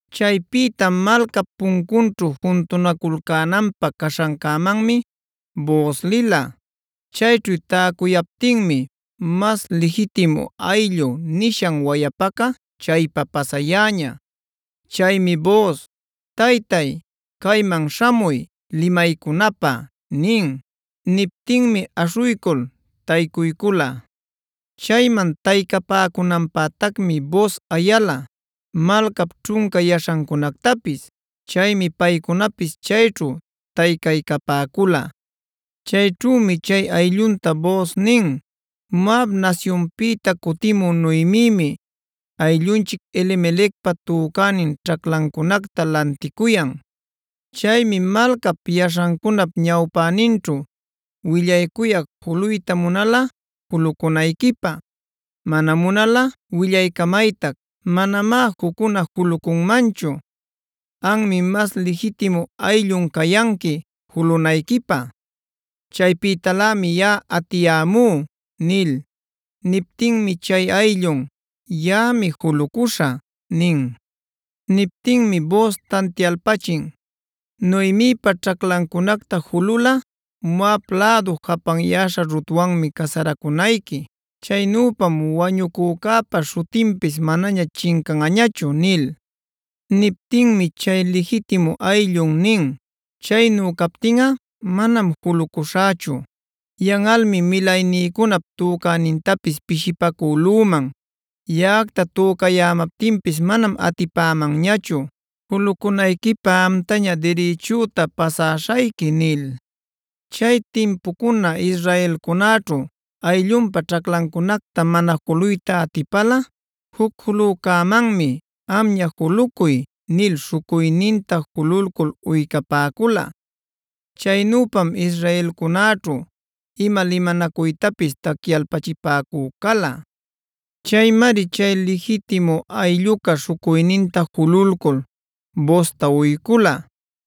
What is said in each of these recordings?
Chaypïta malcap puncunćhu juntunaculcänanpä caśhancämanmi Booz lila. Chayćhu täcuyaptinmi “mas lijitimu ayllu” nishan wayapaca chaypa pasayäña. Chaymi Booz: “Taytay, cayman śhamuy, limaycunapä” nin. Niptinmi aśhuycul taycuycula. Chayman taycapäcunanpätacmi Booz ayala malcap ćhunca yaśhancunactapis. Chaymi paycunapis chayćhu taycaycapäcula. Chayćhümi chay ayllunta Booz nin: “Moab nasyunpïta cutimü Noemimi ayllunchic Elimelecpa tücänin ćhaclancunacta lanticuyan. Chaymi malcap yaśhancunap ñawpäninćhu willaycuyac juluyta munalꞌa julucunayquipä. Mana munalꞌa willaycamaytac. Manamá juccuna julucunmanchu. Anmi mas lijitimu ayllun cayanqui julunayquipä; chaypïtalämi yaꞌa atiyämú” nil. Niptinmi chay ayllun: “Yaꞌami julucuśhä” nin. Niptinmi Booz tantialpachin: “Noemipa ćhaclancunacta jululꞌa, Moab lädu japanyäśha Rutwanmi casaracunayqui. Chaynüpam wañucücäpa śhutinpis manaña chincanꞌañachu” nil. Niptinmi chay lijitimu ayllun nin: “Chaynu captinꞌa manam julucuśhächu. Yanꞌalmi milaynïcunap tücänintapis pishipacülüman. Yaꞌacta tücayämaptinpis manam atipämanñachu; julucunayquipä amtaña dirichüta pasäśhayqui” nil. Chay timpucuna israelcunäćhu ayllunpa ćhaclancunacta mana juluyta atipalꞌa juc julücämanmi “amña julucuy” nil śhucuyninta jululcul uycapäcula. Chaynüpam israelcunäćhu ima limanacuytapis tacyalpachipäcü cala. Chaymari chay lijitimu aylluca śhucuyninta jululcul Boozta uycula: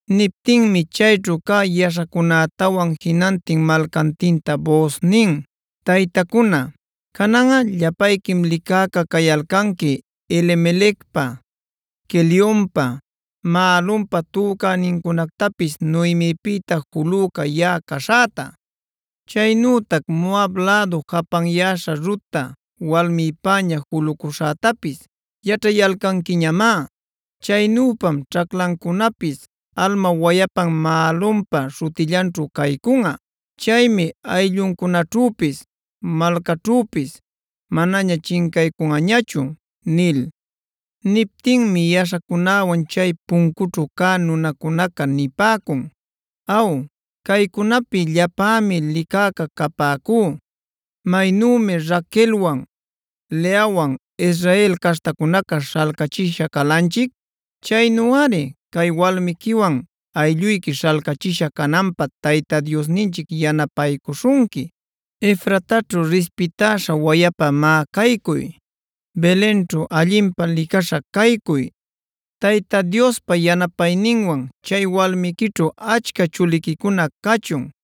Niptinmi chayćhu cä yaśhacunätawan jinantin malcantinta Booz nin: “Taytacuna, cananꞌa llapayquim licäca cayalcanqui Elimelecpa, Quelionpa, Mahlonpa tücänincunactapis Noemipïta julüca yaꞌa caśhäta. Chaynütac Moab lädu japanyäśha Rutta walmïpäña julucuśhätapis yaćhayalcanquiñamá. Chaynüpam ćhaclancunapis alma wayapan Mahlonpa śhutillanćhu caycunꞌa.b Chaymi aylluncunaćhüpis malcaćhüpis manaña chincaycunꞌañachu” nil. Niptinmi yaśhacunäwan chay puncućhu cä nunacunaca nipäcun: “Aw, caycunapi llapämi licäca capäcú. Maynümi Raquelwan, Leawan Israel caśhtacunacac śhalcachisha calanchic, chaynuꞌari cay walmiquiwan aylluyqui śhalcachisha cananpä Tayta Diosninchic yanapaycuśhunqui. Efrataćhu rispitäśha wayapa má caycuy; Belenćhu allinpä licaśha caycuy. Tayta Diospa yanapayninwan chay walmiquićhu achca chuliquicuna cachun.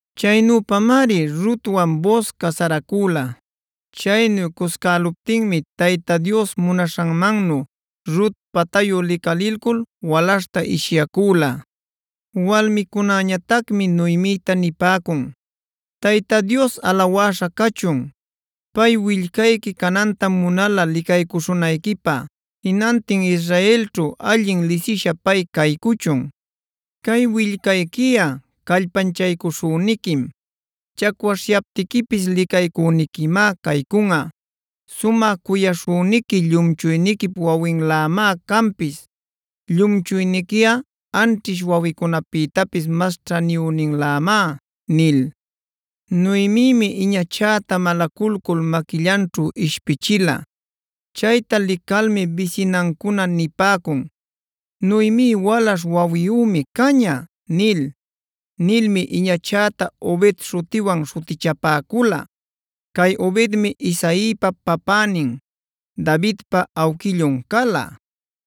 Chaynüpamari Rutwan Booz casaracüla. Chaynu cuscäluptinmi Tayta Dios munaśhanmannu Rut patayu licalilcul walaśhta ishyacüla. Walmicunäñatacmi Noemita nipäcun: “Tayta Dios alawäśha cachun. Pay willcayqui canantam munala licaycuśhunayquipä. Jinantin Israelćhu allin lisisha pay caycuchun. Cay willcayquiꞌa callpanchaycuśhüniquim; chacwaśhyaptiquipis licaycüniquimá caycunꞌa. Sumä cuyaśhüniqui llumchuyniquip wawinlämá canpis. Llumchuyniquiꞌa anćhish wawicunapïtapis mas ćhaniyüninlämá” nil. Noemimi iñachäta malaculcul maquillanćhu ishpichila. Chayta licalmi bisinancuna nipäcun: “¡Noemi walaśh wawiyümi caña!” nil. Nilmi iñachäta “Obed” śhutiwan śhutichapäcula. Cay Obedmi Isaipa papänin, Davidpa awquillun cala.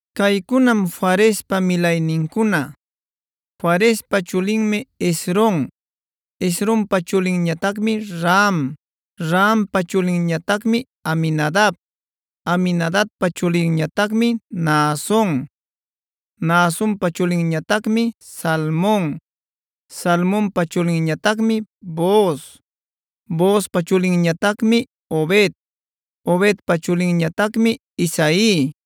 Caycunam Farespa milaynincuna: Farespa chulinmi Hezron. Hezronpa chulinñatacmi Ram; Rampa chulinñatacmi Aminadab. Aminadabpa chulinñatacmi Naason; Naasonpa chulinñatacmi Salmon. Salmonpa chulinñatacmi Booz; Boozpa chulinñatacmi Obed. Obedpa chulinñatacmi Isai;